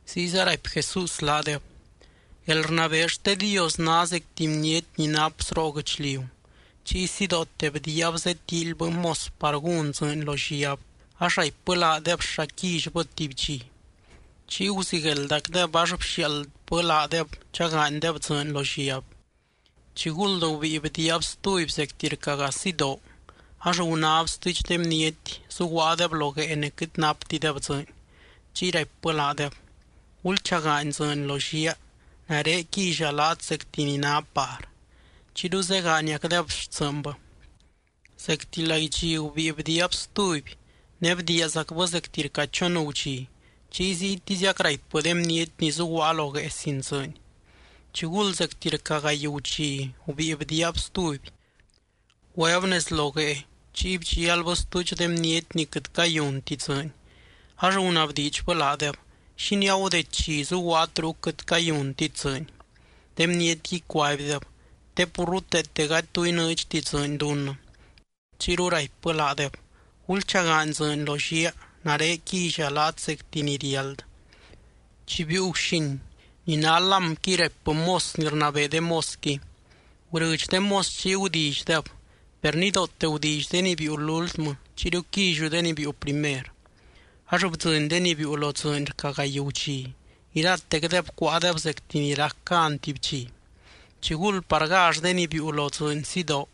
Ziyza raipy Jesús laadeb: —Guelrnabee xte Dios ná zec tuby bniety ni nap sroo guɨchliu. Chiy sidoote bdiiab zetíilybɨ mos par gún dzɨɨny lo lliab, ax raipbɨ laadeb xa quillybɨ tuby dxi. Chiy guzigueldacdeb ax bxiaaldbɨ laadeb chagaanydeb dzɨɨny lo lliab. Chiguld gubíi bdiiab stuby zecti rca gaa sidoo, ax gunáb stuudx de bniety zuguaadeb lo guee ne quɨt naptideb dzɨɨny. Chiy raipbɨ laadeb: “Gulchagaany dzɨɨny lo lliaa, nare quilla laat zecti ni ná par” Chiyru zegaaniacdeb xtsɨɨnbɨ. Zecti laidxi gubíi bdiiab stuby ne bdiiazacbɨ zecti rca chon gudxi, chiy ziytiziac raipbɨ de bniety ni zuguaa lo guee sin dzɨɨny. Chiguld zecti rca gaay gudxi, gubíi bdiiab stuby. Güeb nez lo guee, chiy bdxialbɨ stuudx de bniety ni quɨt cayunti dzɨɨny. Ax gunabdiidxbɨ laadeb: “¿Xínii agudeddxi zuguaat ruc quɨt cayuntit dzɨɨny?” De bnietqui cuaibdeb: “Te pur ruteete gady tu inɨɨdxti dzɨɨny dunnɨ.” Chiyru raipbɨ laadeb: “Gulchagaany dzɨɨny lo lliaa, nare quilla laat zecti ni riáld.” Chi biiu guxin, ni ná lámqui raipbɨ mos ni rnabee de mosqui: “Gurɨdx de mos chiy gudillydeb. Per nidoote gudilly de ni biiu lúltmɨ, chiyru quilliu de ni biiu primer.” Ax bdzɨny de ni biiu lo dzɨɨny rca gaay gudxi, iratecdeb cuáadeb zectic ni rac gan tuby dxi. Chiguld par gall de ni biiu lo dzɨɨny sidoo,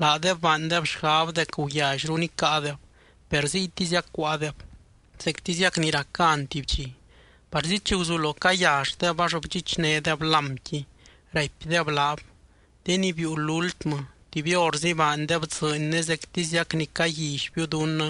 laadeb baandeb xgab dec guyallyru nicáadeb. Per ziytiziac cuáadeb, zectiziac ni rac gan tuby dxi. Parzi chi guzulo cayalldeb ax bdxichnédeb lámqui. Raipdeb laab: “De ni biiu lúltmɨ, tuby horzi baandeb dzɨɨny ne zectiziac ni caguillybiu dunnɨ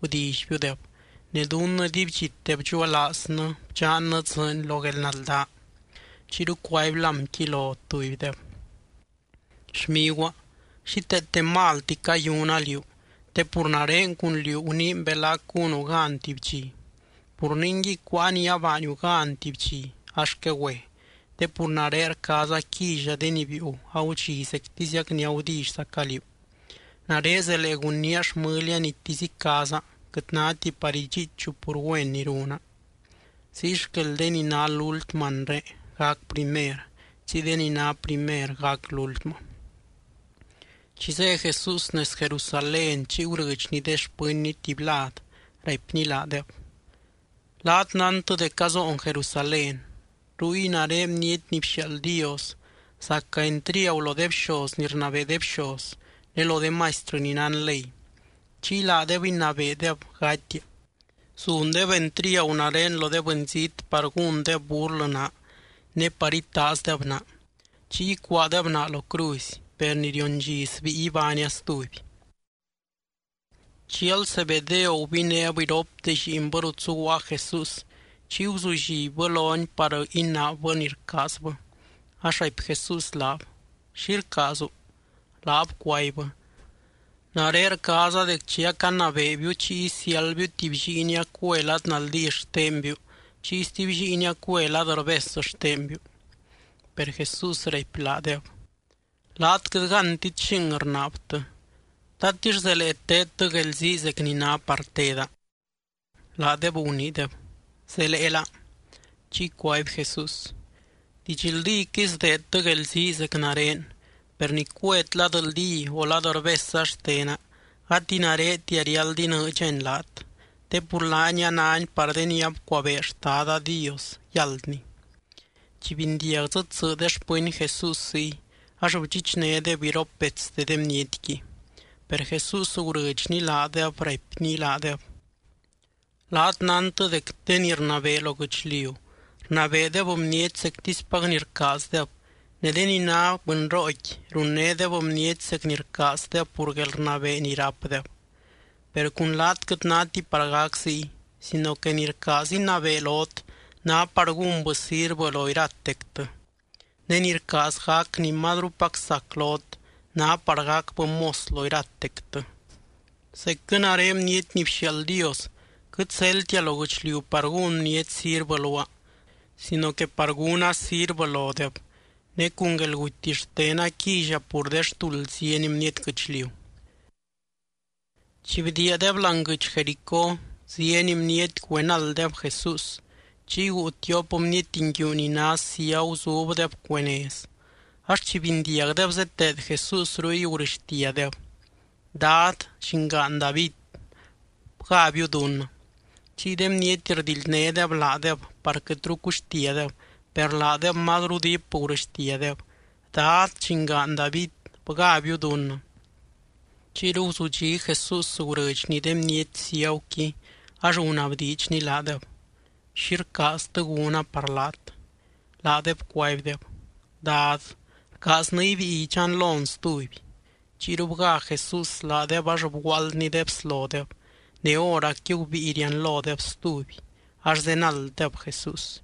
gudillybiudeb, ne dunnɨ dibydxite bdxuelaaznɨ bdxannɨ dzɨɨny lo guelnaldaa.” Chiyru cuaby lámqui lo tubydeb: “Xmiguaa, xíteete malti cayuna liú, te pur nare cun liú guniin belac gúnu gan tuby dxi. Pur ningui, cuáa ni abaaniu gan tuby dxi, ax quegüe. Te pur nare rcaaza quilla de ni biiu agudxi zectiziac ni agudillyzaca liú. Nare zelee gunnía xmɨlia nitisy icaaza, quɨt náti par idxiichu pur güen ni runa.” Ziy xquel de ni ná lúltmɨ anre, gac primer, chiy de ni ná primer gac lúltmɨ. Chi zé Jesús nez Jerusalén chiy gurɨdxny de xpɨnny tuby lad, raipny laadeb: —Laat nántɨ dec azoon Jerusalén. Ruy nare Bniety ni bxiaald Dios zaca entriagu lo de bxoz ni rnabee de bxoz ne lo de maistrɨ ni nán ley, chiy laadeb inabeedeb gatia. Zundeb entriagu nare lo de bɨnzít par gúndeb burlɨ naa ne par itaazdeb naa. Chiy icuaadeb naa lo cruzy, per ni rion dxi sbíi ibánia stuby. Chial Zebedeo gubinéb iropte lliinbɨ rut zuguaa Jesús, chiy guzullibbɨ lony par inaabbɨ ni rcaazbɨ. Ax raipy Jesús laab: —¿Xi rcaazu? Laab cuaibbɨ: —Nare rcaaza dec chi acanabeebiu chiy isiáldbiu tuby lliinia cue lad naldí xtenbiu, chiy stuby lliinia cue lad rbes xtenbiu. Per Jesús raipy laadeb: —Laat quɨt gántit xing rnaabtɨ. ¿Tatix zelee teedtɨ guelzii zec ni ná par teda? Laadeb guniideb: —Zeleela. Chiy cuaby Jesús: —Didxldíquɨy sdeedtɨ guelzii zec nare, per ni cuet lad naldí o lad rbesza xtena, gati naretia riáld inɨɨdxani laat, te pur laani a náni par de ni abcuabee Xtada Dios yáldni. Chi bindiag dzɨ tsɨ de xpɨny Jesús ziy, ax bdxichnédeb iropbetste de bnietqui. Per Jesús gurɨdxny laadeb, raipny laadeb: —Laat nántɨ dec de ni rnabee lo guɨchliu, rnabeedeb bniety zectispac ni rcaazdeb, ne de ni ná bɨnrooqui, runnédeb bniety zec ni rcaazdeb pur guelrnabee ni rápdeb. Per cun laat quɨt náti par gac ziy, sino que ni rcaaz inabee lot, ná par gúnbɨ sirvɨ lo iratectɨ. Ne ni rcaaz gac ni mazrupac sac lot, ná par gacbɨ mos lo iratectɨ. Zecquɨ nare Bniety ni bxiaald Dios quɨt zeldtia lo guɨchliu par gún bniety sirvɨ luaa, sino que par gúna sirvɨ lodeb, ne cun guelguty xtena quilla pur de xtuld zieny bniety guɨchliu. Chi bdiiadeb láani guɨdx Jericó zieny bniety güenalddeb Jesús. Chiy guu tiop bniety nguiu ni ná ciagu zubdeb cuee nez, ax chi bindiagdeb zeteed Jesús ruy, gurɨxtiadeb: —¡Dad, llingaan David, bgábiu dunnɨ! Chiy de bniety rdildnédeb laadeb par quɨtru cuxtiadeb, per laadeb mazru diip gurɨxtiadeb: —¡Dad, llingaan David, bgábiu dunnɨ! Chiyru guzudxí Jesús, gurɨdxny de bniety ciaguqui ax gunabdiidxny laadeb: —¿Xi rcaaztɨ gúna par laat? Laadeb cuaibdeb: —Dad, rcaaznɨ ibíi idxanlon stuby. Chiyru bgá Jesús laadeb, ax bguaaldny de bslodeb. Ne hóracqui gubíi rianlodeb stuby, ax zenalddeb Jesús.